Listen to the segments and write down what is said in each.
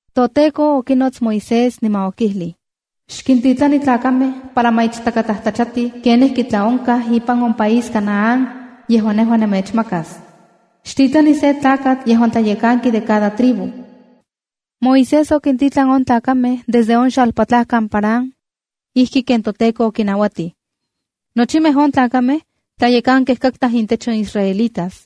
ToTEKO okinots Moisés niman okijlij: “Xkintitlani tlakamej para ma ichtakatlajtlachatij kenijki tlaonkaj ipan on país Canaán yejuan nejua nemechmakas. Xtitlani se tlakatl yejuan tlayekanki de cada tribu.” Moisés okintitlan on tlakamej desde on xalpatlajkan Parán ijki ken toTEKO okinauatij. Nochimej on tlakamej tlayekankej katkaj intech on israelitas.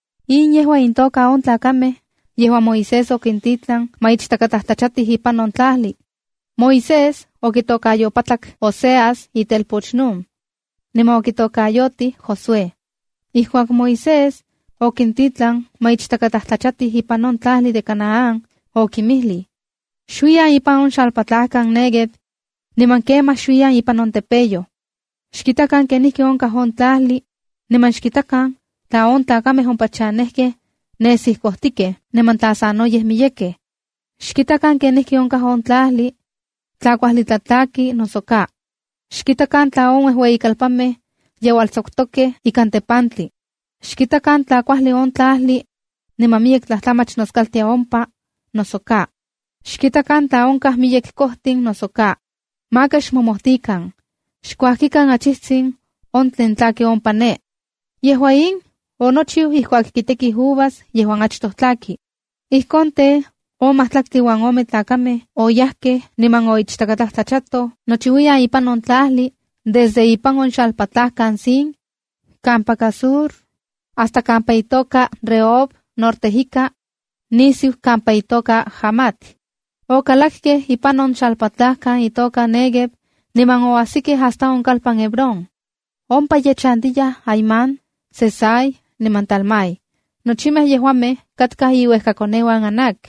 In yejua intoka on tlakamej yejuan Moisés okintitlan ma ichtakatlajtlachatij ipan on tlajli. (Moisés okitokayopatlak Oseas itelpoch Nun, niman okitokayotij Josué.) Ijkuak Moisés okintitlan ma ichtakatlajtlachatij ipan on tlajli de Canaán, okinmijlij: —Xuiyan ipan on xalpatlajkan Néguev niman kemaj xuiyan impan on tepeyoj. Xkitakan kenijki onkaj on tlajli niman xkitakan tla on tlakamej ompa chanejkej nesij kojtikej, niman tla sanoyej miyekej. Xkitakan kenijki onkaj on tlajli, tla kuajli tlatlaki, noso ka. Xkitakan tla on uejueyikalpanmej yeualtsakutokej ikan tepantli. Xkitakan tla kuajli on tlajli niman miyek tlajtlamach noskaltia ompa, noso ka. Xkitakan tla onkaj miyek kojtin, noso ka. Maka xmomojtikan. Xkuajkikan achijtsin on tlen tlaki ompa ne.” Yejua in, onochiu ijkuak kitekij uvas yejuan achtoj tlaki. Ijkon tej, on majtlaktli uan ome tlakamej oyajkej niman oichtakatlajtlachatoj nochiuiyan ipan on tlajli desde ipan on xalpatlajkan Zin, kampaka Sur, hasta kampa itoka Rehob norte ika, nisiu kampa itoka Hamat. Okalakej ipan on xalpatlajkan itoka Néguev niman oajsikej hasta on kalpan Hebrón. Ompa ye chantiyaj Ahimán, Sesai niman Talmai. Nochimej yejuamej katkaj iuejkakoneuan Anac.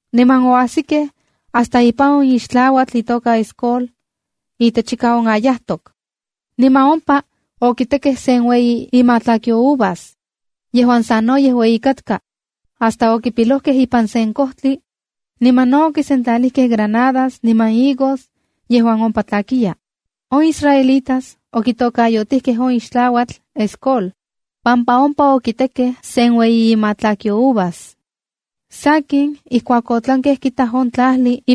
Niman oasikej hasta ipan on ixtlauatl itoka Escol itechika on ayajtok. Niman ompa okitekej sen ueyi imatlakyo uvas, yejuan sanoyej ueyi katka, hasta okipilojkej ipan sen kojtli niman omemej tlakamej okechpanojtiajkej. Niman no okisentlalijkej granadas niman higos yejuan ompa tlakiya. On israelitas okitokayotijkej on ixtlauatl Escola, pampa ompa okitekej sen ueyi imatlakyo uvas. Sakin, ijkuak otlankej kitaj on tlajli,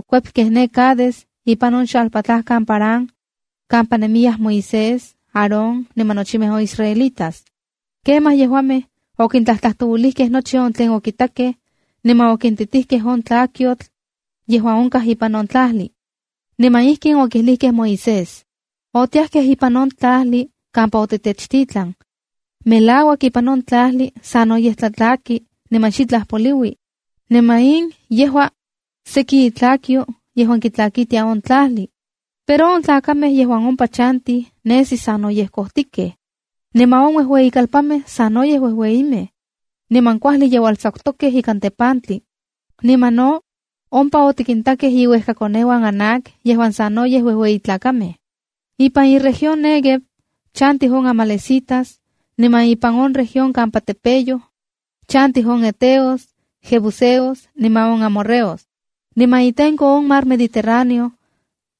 ne Cades ipan on xalpatlajkan Parán kampa nemiyaj Moisés, Aarón niman nochimej on israelitas. Kemaj yejuamej okintlajtlajtouilijkej nochi on tlen okitakej, niman okintitijkej on tlakyotl yejuan onkaj ipan on tlajli. Niman ijkin okijlijkej Moisés: —Otiajkej ipan on tlajli kampa otitechtitlan. Melauak ipan on tlajli sanoyej tlatlaki niman xitlaj poliui. Niman in yejua seki itlakyo yejuan kitlakitia on tlajli. Pero on tlakamej yejuan ompa chantij nesij sanoyej kojtikej, niman on uejueyikalpanmej sanoyej uejueyimej, niman kuajli yeualtsakutokej ikan tepantli. Niman no ompa otikintakej iuejkakoneuan Anac yejuan sanoyej uejueyi tlakamej. Ipan iueyitlalpan Néguev, chantij on amalecitas, niman ipan on región kampa tepeyoj chantij on heteos, jebuseos niman on amorreos. Niman itenko on mar Mediterráneo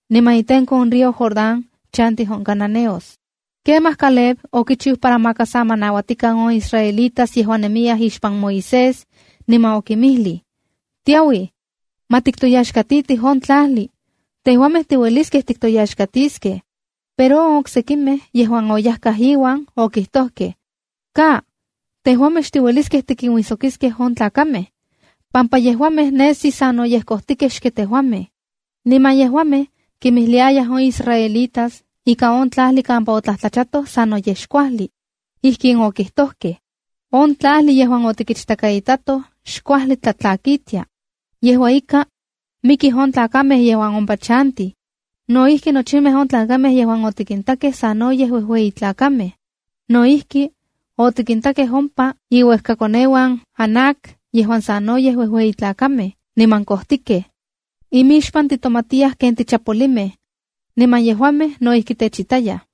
niman itenko on río Jordán chantij on cananeos. Kemaj Caleb okichiu para maka sa ma nauatikan on israelitas yejuan nemiyaj ixpan Moisés, niman okinmijlij: —¡Tiauij! ¡Ma tiktoyaxkatitij on tlajli! ¡Tejuamej tiueliskej tiktoyaxkatiskej! Pero on oksekimej yejuan oyajkaj iuan, okijtojkej: —Ka, tejuamej xtiueliskej tikinuijsokiskej on tlakamej, pampa yejuamej nesi sanoyej kojtikej xken tejuamej. Niman yejuamej kimijliayaj on israelitas ika on tlajli kampa otlajtlachatoj sanoyej xkuajli. Ijkin okijtojkej: —On tlajli yejuan otikichtakaitatoj xkuajli tlatlakitia. Yejua ika, mikij on tlakamej yejuan ompa chantij. No ijki, nochimej on tlakamej yejuan otikintakej sanoyej uejueyi tlakamej. No ijki, otikintakej ompa iuejkakoneuan Anac yejuan sanoyej uejueyi tlakamej niman kojtikej. Imixpan titomatiyaj ken tichapolimej, niman yejuamej no ijki techitayaj.